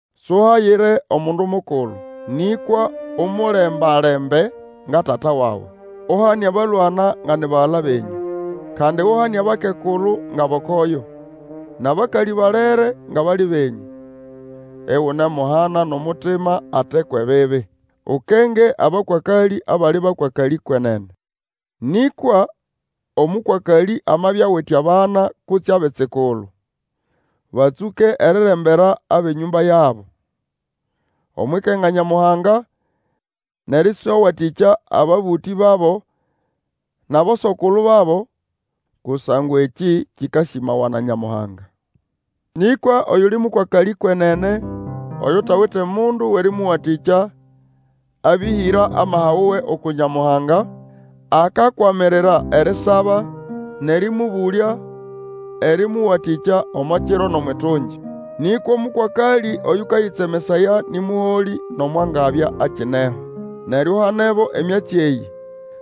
Suhayire omundu mukulu, nĩkwa umulemba-lembe nga tata wawe. Uhane abalwana nga ni bagala benyũ. Kandi uhane abakekulu ngʼabokoyo, nʼabakalĩ balere ngʼabali benyũ, igunemuhana nʼomutima ate kwʼebibi. Ukenge abakwakalĩ abali bakwakalĩ kwenene. Nĩkwa omũkwakalĩ amabya awite abana kutse abitsikulu, batsũke erirembera abʼenyũmba yabo, omwʼikenga Nyamuhanga nʼerĩswawatĩkya ababũtĩ babo nʼaboso-kulu babo, kusangwa ekĩ kĩkasĩmawa na Nyamuhanga. Nĩkwa oyuli mũkwakalĩ kwenene, oyutawite mundu wʼerĩmũwatĩkya, abĩhĩra amaha wuwe uku Nyamuhanga, akakwamirira erisaba nʼerĩmũbũlya erĩmũwatĩkya omo kiro nʼomwʼitungi. Nĩkwa omũkwakalĩ oyũkayĩtsemesaya nĩ mũholĩ nomo angabya akineho. Neryo uhanebo emyatsi eyĩ,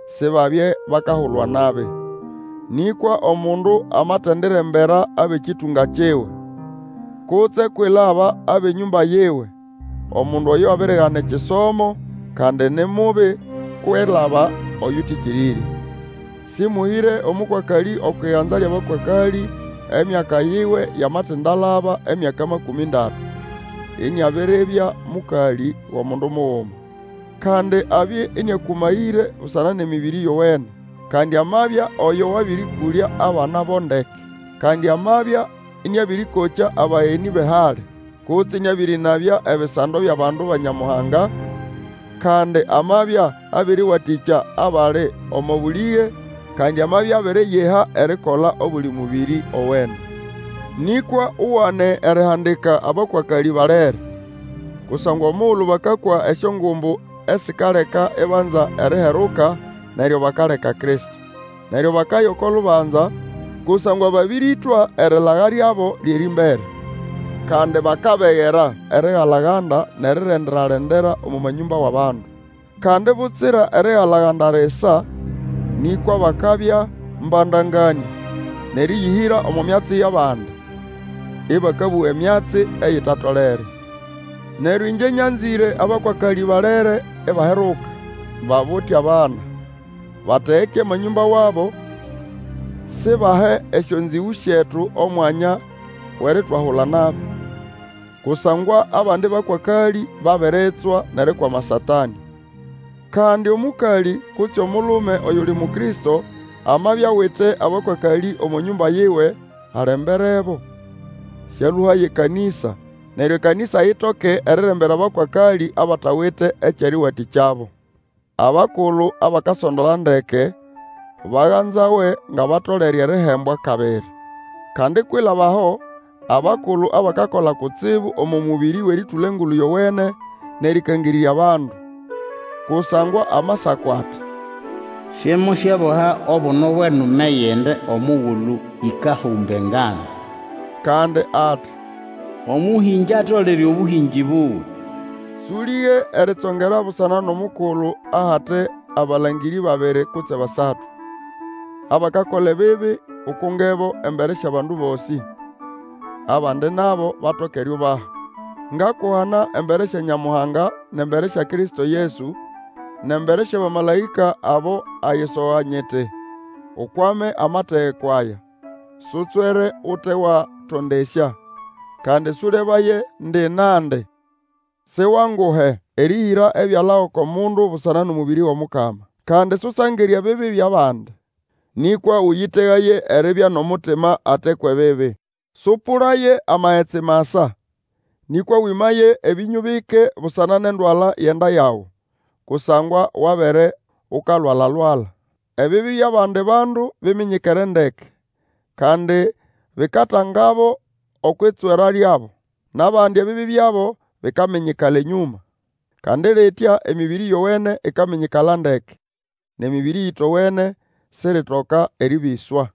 Sibabye bakahulwa nabi. Nĩkwa omundu amatendirembera abʼekĩtũnga kiwe, kutse kwilaba abʼenyũmba yiwe, omundu oyo abirigana ekisomo, kandi ni mubi kwilaba oyũtĩkĩrĩrye. Sĩmũhĩre omũkwakalĩ okwʼiganza lyʼabakwakalĩ, emyaka yiwe yamatindalaba emyaka makũmĩ ndatu, iniabiribya mũkalĩ wʼomundu muguma. Kandi abye ĩnĩakũmayĩre busana nʼemĩbĩrĩ yowene; landi amabya oyo wabĩrĩkũlya abana bo ndeke, kandi amabya ĩnĩabĩrĩkokya abagenĩ bʼehali, kutse ĩnĩabĩrĩnabya ebisando byʼabandu ba Nyamuhanga, kandi amabya abĩrĩwatĩkya abali omo bũlĩge, kandi amabya abiriyiha erikola obuli mũbĩrĩ owene. Nĩkwa ugane erihandika abakwakalĩ balere, kusangwa omugulu bakakwa esyongumbu esikaleka ibanza eriheruka, neryo bakaleka Kristo. Neryo bakaya oko lubanza, kusangwa babĩrĩtwa erilaga lyabo lyʼerĩmbere. Kandi bakabegera erigala-ganda nʼerirendera-lendera omo manyũmba wʼabandu. Kandi butsira erigala-ganda lisa, nĩkwa bakabya mbandanganĩa, nʼerĩyĩhĩra omo myatsi yʼabandi, ĩbakabũga emyatsi eyitatolere. Neryo ĩngye nyanzĩre abakwakalĩ balere ibaheruka, babute abana, bategeke amanyũmba wabo, sibahe esyonzĩgũ syetu omwanya wʼeritwahula nabi. Kusangwa abandi bakwakalĩ babiritswa nʼerikwama Satanĩ. Kandi omũkalĩ kutse omulume oyuli Mukristo, amabya awite abakwakalĩ omo nyũmba yiwe, alemberebo, sĩalũhaye ekanĩsa, neryo ekanĩsa itoke erirembera abakwakalĩ abatawite ekyʼerĩwatĩkyabo. Abakulu abakasondola ndeke baganzawe ngʼabatolere erihembwa kabiri. Kandi kwilaba aho, abakulu abakakola kutsibu omo mũbĩrĩ wʼerĩtũla Engulu Yowene, nʼerĩkangĩrĩrya bandu. Kusangwa Amasako ati, Simusyeboha obuno bwʼenume yʼende omugulu ĩkahũmba engano. Kandi ati, Omũhĩngĩ atolere obũhĩngĩ buwe. Sũlĩge eritsongera busana nʼomukulu ahate abalangĩrĩ babiri kutse basatu. Abakakola ebibi ukungebo embere syʼabandu bosĩ, abandi nabo batoke eriubaha. Ngakuhana embere sya Nyamuhanga, nʼembere sya Kristo Yesu, nʼembere syʼabamalaĩka abo ayisoga nyiti, Ukwame amategeko aya, sutswere ute watondesya, kandi sũlebaye ndi nandi. Siwanguhe erĩhĩra ebyala oko mundu busana nʼomũbĩrĩ wʼOmukama. Kandi susangire ebibi byʼabandi, nĩkwa Ũyĩtegaye eribya nʼomutima ate kwʼebibi. Sũpũlaye amagetsi masa, nĩkwa wĩmaye ebĩnyũ bike busana nʼendwala yʼenda yawe, kusangwa Wabere ukalwalalwala. Ebibi byʼabandi bandu biminyikere ndeke, kandi bikatangabo okwʼitswera lyabo; nʼabandi, ebibi byabo bikaminyikala enyũma. Kandi litya emĩbĩrĩ yowene ikaminyikala ndeke. Nʼemĩbĩrĩ eyĩtowene siritoka erĩbĩswa.